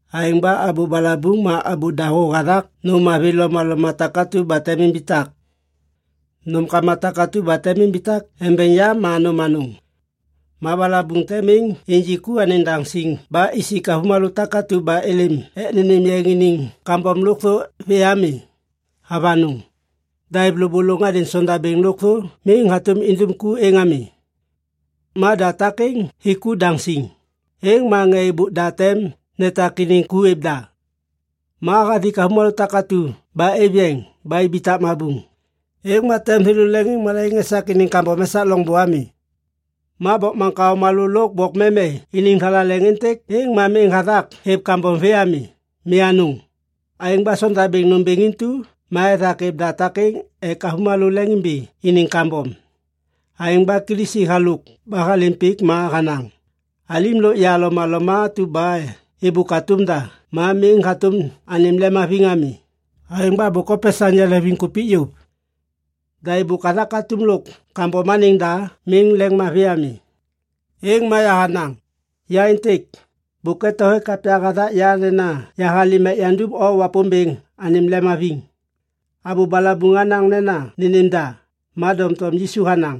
Aêŋ ba abô balabuŋ ma abô dahô hathak nôm mavi lomaloma takatu ba tem imbitak. Nômkama takatu ba tem imbitak embeŋ yam ma nôm anôŋ. Ma balabuŋ tem miŋ injik ku anêŋ daŋ siŋ ba isik avômalô takatu ba êlêm ek nênêm yeŋ iniŋ kambom lôkthô vê ami. Avanôŋ. Da êv lôbôlôŋ hadêŋ sondabêŋ lôkthô miŋ hatôm indum ku êŋ ami. Ma da takêŋ hik ku daŋ siŋ, êŋ ma ŋê êbôk da tem netak iniŋ ku êv da. Ma hathik avômalô takatu ba êv yeŋ ba ibitak mabuŋ, êŋ ma tem thêlô leŋiŋmalaiŋ esak iniŋ kambom esak loŋbô ami. Ma bokmaŋkao malô lôk bokmeme iniŋ thalaleŋ êntêk êŋ miŋ hathak hêv kambom vê ami. Mi anôŋ. Aêŋ ba sondabêŋ nômbêŋ intu ma ethak êv da takêŋ ek avômalô leŋimbi iniŋ kambom. Aêŋ ba Kilisi halôk ba halêm pik ma hanaŋ, “Alim lôk ya lomaloma atu ba êbôk hatôm da ma miŋ hatôm anêm lemhaviŋ ami, aêŋ ba bôk hopesaŋ yaleŋviŋkupik yôv. Da êbôk hathak atum lôk kambom anêŋ da miŋ lemmavi ami. Êŋ ma yahanaŋ, ‘Ya êntêk. Bôk eto hêk kapya hathak ya nena yahalêm ek yandum O Wapômbêŋ anêm lemhaviŋ.’” Abô balabuŋ hanaŋ nena nênêm da, ma doŋtom Yisu hanaŋ,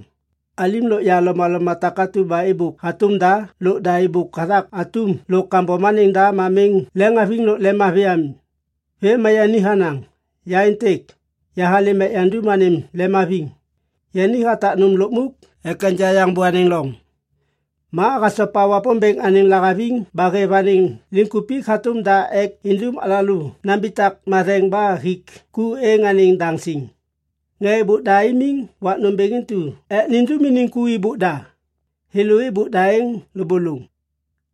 “Alim lôk ya lomaloma takatu ba êbôk hatôm da lôk da êbôk hathak atum lôk kambom anêŋ da ma miŋ lemhaviŋ lôk lemmavi ami.” Vêm ma yani hanaŋ, “Ya êntêk. Yahalêm ek yandum anêm lemhaviŋ.” Yani hatak nôm lukmuk ek enja yaŋ bô anêŋ loŋ. Ma hasopa Wapômbêŋ anêŋ lahaviŋ ba hêv anêŋ liŋkupik hatôm da ek indum alalô nambitak matheŋ ba hik ku êŋ anêŋ daŋ siŋ. Ŋê êbôk da imiŋ wak nômbêŋ intu ek nindum iniŋ ku nêmbôk da. Thêlô êbôk da êŋ lôbôlôŋ.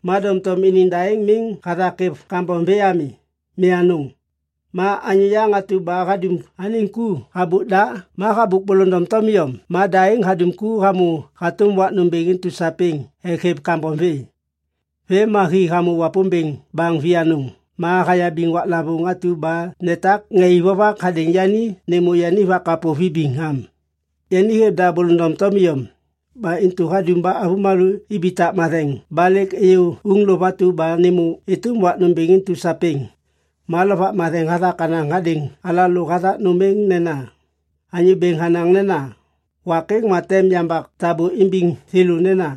Ma doŋtom iniŋ da êŋ miŋ hathak hêv kambom vê ami. Mi anôŋ. Ma anyô yaŋ atu ba hadum anêŋ ku habôk da ma habôk bôlôŋ doŋtom iyom ma da êŋ hadum ku hamô hatôm wak nômbêŋ intu sapêŋ ek hêv kambom vê. Vêm ma hi hamô Wapômbêŋ baŋ vianôŋ ma hayabiŋ waklavôŋ atu ba netak ŋê ik vovak hadêŋ yani nêmô yani vakapô vibiŋ am. Yani hêv da bôlôŋ doŋtom iyom. Ba intu hadum ba avômalô ibitak matheŋ ba lêk êyô uŋlôv atu ba nêmô êtôm wak nômbêŋ intu sapêŋ. Ma Lovak Matheŋ hathak hanaŋ hadêŋ alalô hathak nôm êŋ nena, “Anyô Bêŋ hanaŋ nena, ‘Wak êŋ ma tem yambak tabô imbiŋ thêlô nena,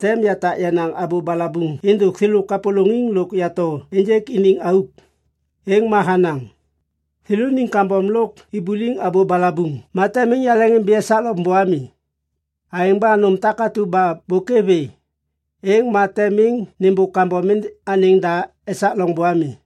“Tem yatak yenaŋ abô balabuŋ êndôk thêlô kapôlôŋiŋ lôk yato ênjêk iniŋ auk.”’” Êŋ ma hanaŋ, “Thêlôniŋ kambom lôk ibuliŋ abô balabuŋ ma tem miŋ yaleŋimbi esak loŋbô ami.” Aêŋ ba nôm takatu ba bôk êv vê, êŋ ma tem miŋ nêmbôk kambom anêŋ da esak loŋbô ami.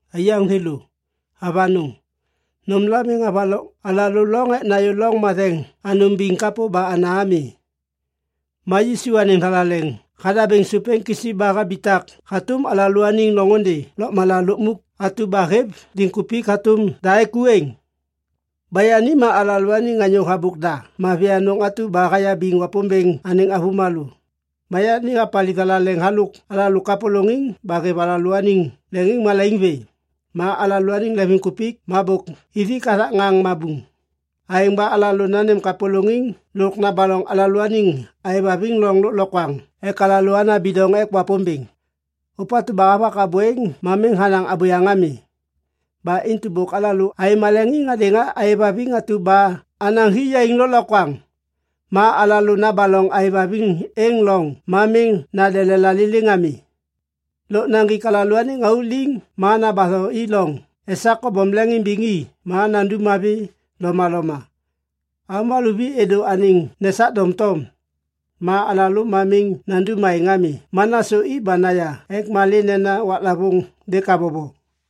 Aiyaŋ thêlô, avanôŋ! Nômla miŋ havaloŋ alalô loŋ ek nayô Loŋ Matheŋ Anôŋ Biŋ kapô ba ana ami. Ma Yisu anêŋ thalaleŋ hadabêŋ sôp êŋ kisi ba habitak hatôm alalôaniŋ loŋôndê lôkmala lukmuk atu ba hêv liŋkupik hatôm da ek ku êŋ. Ba yani ma alalôaniŋ anyô habôk da mavi anôŋ atu ba hayabiŋ Wapômbêŋ anêŋ avômalô. Ma yani hapaliv thalaleŋ halôk alalô kapôlôŋiŋ ba hêv alalôaniŋ leŋiŋmalaiŋ vê. Ma alalôaniŋ leŋviŋkupik ma bôk ithik hathak ŋaŋ mabuŋ. Aêŋ ba alalô nanêm kapôlôŋiŋ lôk nabaloŋ alalôaniŋ aêvhaviŋ loŋ lôklokwaŋ ek alalô ana bidoŋ ek Wapômbêŋ. Ôpatu ba havak abô êŋ ma miŋ hanaŋ abôyaŋ ami. Ba intu bôk alalô aêv maleŋiŋ hadêŋ aêvhaviŋ atu ba anaŋ hi yaiŋ lôklokwaŋ. Ma alalô nabaloŋ aêvhaviŋ êŋ loŋ ma miŋ nande lelaliliŋ ami. Lôk naŋgik alalôaniŋ auk liŋ ma nambatho i loŋ esak kobom leŋiŋimbiŋ i ma nandum mavi lomaloma. Avômalô vi êdô anêŋ nesak doŋtom. Ma alalô ma miŋ nandum aêŋ ami ma nasôi ba naya ek malê nena waklavôŋ lêk habobo.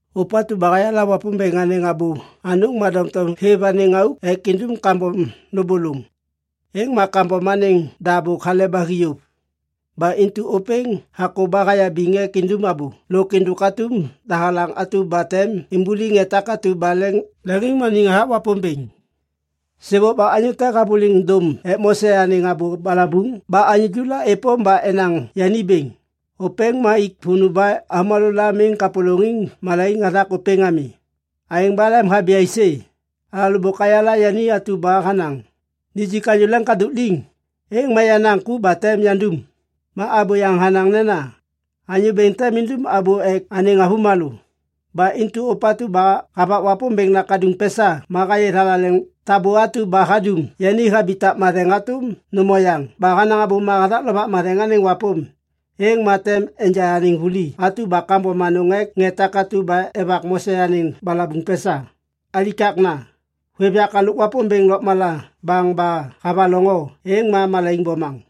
Ôpatu ba hayala Wapômbêŋ anêŋ abô anôŋ ma doŋtom hêv anêŋ auk ek indum kambom lôbôlôŋ, êŋ ma kambom anêŋ da bôk hale ba hi yôv. Ba intu ôpêŋ hakô ba hayabiŋ ek indum abô lôk êndôk atum dahalaŋ atu ba tem imbuliŋ ŋê takatu ba leŋiŋmaniŋ hathak Wapômbêŋ. Sêbôk ba anyô te havôliŋ dôm ek Mose anêŋ abô balabuŋ ba anyô ju la êpôm ba enaŋ yani bêŋ, ôpêŋ ma ik vônô ba avômalô la miŋ kapôlôŋ malaiŋ hathak ôpêŋ ami. Aêŋ ba lemhabi aisê? Alalô bôk ayala yani atu ba hanaŋ, “Nijik anyô leŋkadôk liŋ, êŋ ma yenaŋ ku ba tem yandum.” Ma abô yaŋ hanaŋ nena, “Anyô Bêŋ tem indum abô ek anêŋ avômalô.” Ba intu ôpatu ba havak Wapômbêŋ Nakaduŋ pesa ma hayê thalaleŋ tabô atu ba hadum yani habitak matheŋ hatôm nôm oyaŋ ba hanaŋ abôma hathak Lovak Matheŋ anêŋ wapôm, êŋ ma tem enja anêŋ vuli atu ba kambom anôŋ ek ŋê takatu ba evak Mose anêŋ balabuŋ pesa. Alikakna. Hôêv yak halôk Wapômbêŋ Lôkmala baŋ ba havaloŋ o, êŋ ma malaiŋ bomaŋ.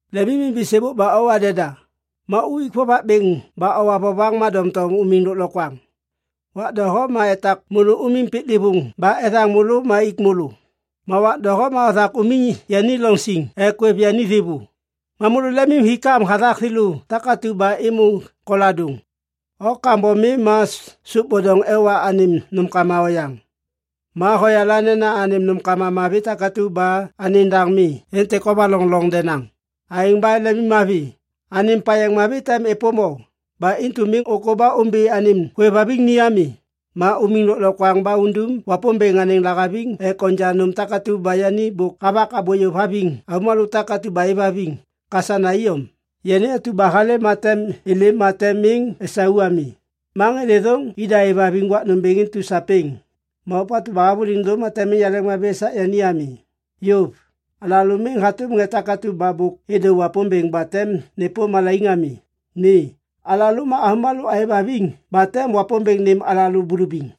Lemimimbi sêbôk ba owa deda. Ma uik vovak bêŋ ba owa vovaŋ ma doŋtom umiŋ lôklokwaŋ. Wak doho ma etak môlô umiŋ piklêvôŋ ba ethaŋ môlô ma ik môlô. Ma wak doho ma othak umiŋ yani loŋ siŋ ek hôêv yani thêvô. Ma môlô lemimhikam hathak thêlô takatu ba êmô koladôŋ. O kambom mi ma sôp bidoŋ ewa anêm nômkama oyaŋ. Ma hoyala nena anêm nômkama mavi takatu ba anêŋ daŋ mi êntêk hovaloŋ loŋ denaŋ. Aêŋ ba lemimmavi. Anêm payeŋ mavi tem êpôm o. Ba intu miŋ ôkô ba ômbi anêm hôêvhaviŋ ni ami. Ma umiŋ lôklokwaŋ ba undum Wapômbêŋ anêŋ lahaviŋ ek onja nôm takatu ba yani bôk havak abô yôv haviŋ avômalô takatu ba êvhaviŋ. Kasana iyom, “Yani atu ba halêm ma tem êlêm ma tem miŋ esau ami. Ma ŋê thêthôŋ ida êvhaviŋ wak nômbêŋ intu sapêŋ. Ma ôpatu ba havôliŋ dôm ma tem miŋ yaleŋmavi esak yani ami.” Yôv. Alalô miŋ hatôm ŋê takatu ba êdô Wapômbêŋ ba tem nêpôm malaiŋ ami. Mi. Alalô ma avômalô aêvhaviŋ ba tem Wapômbêŋ nêm alalô bulubiŋ.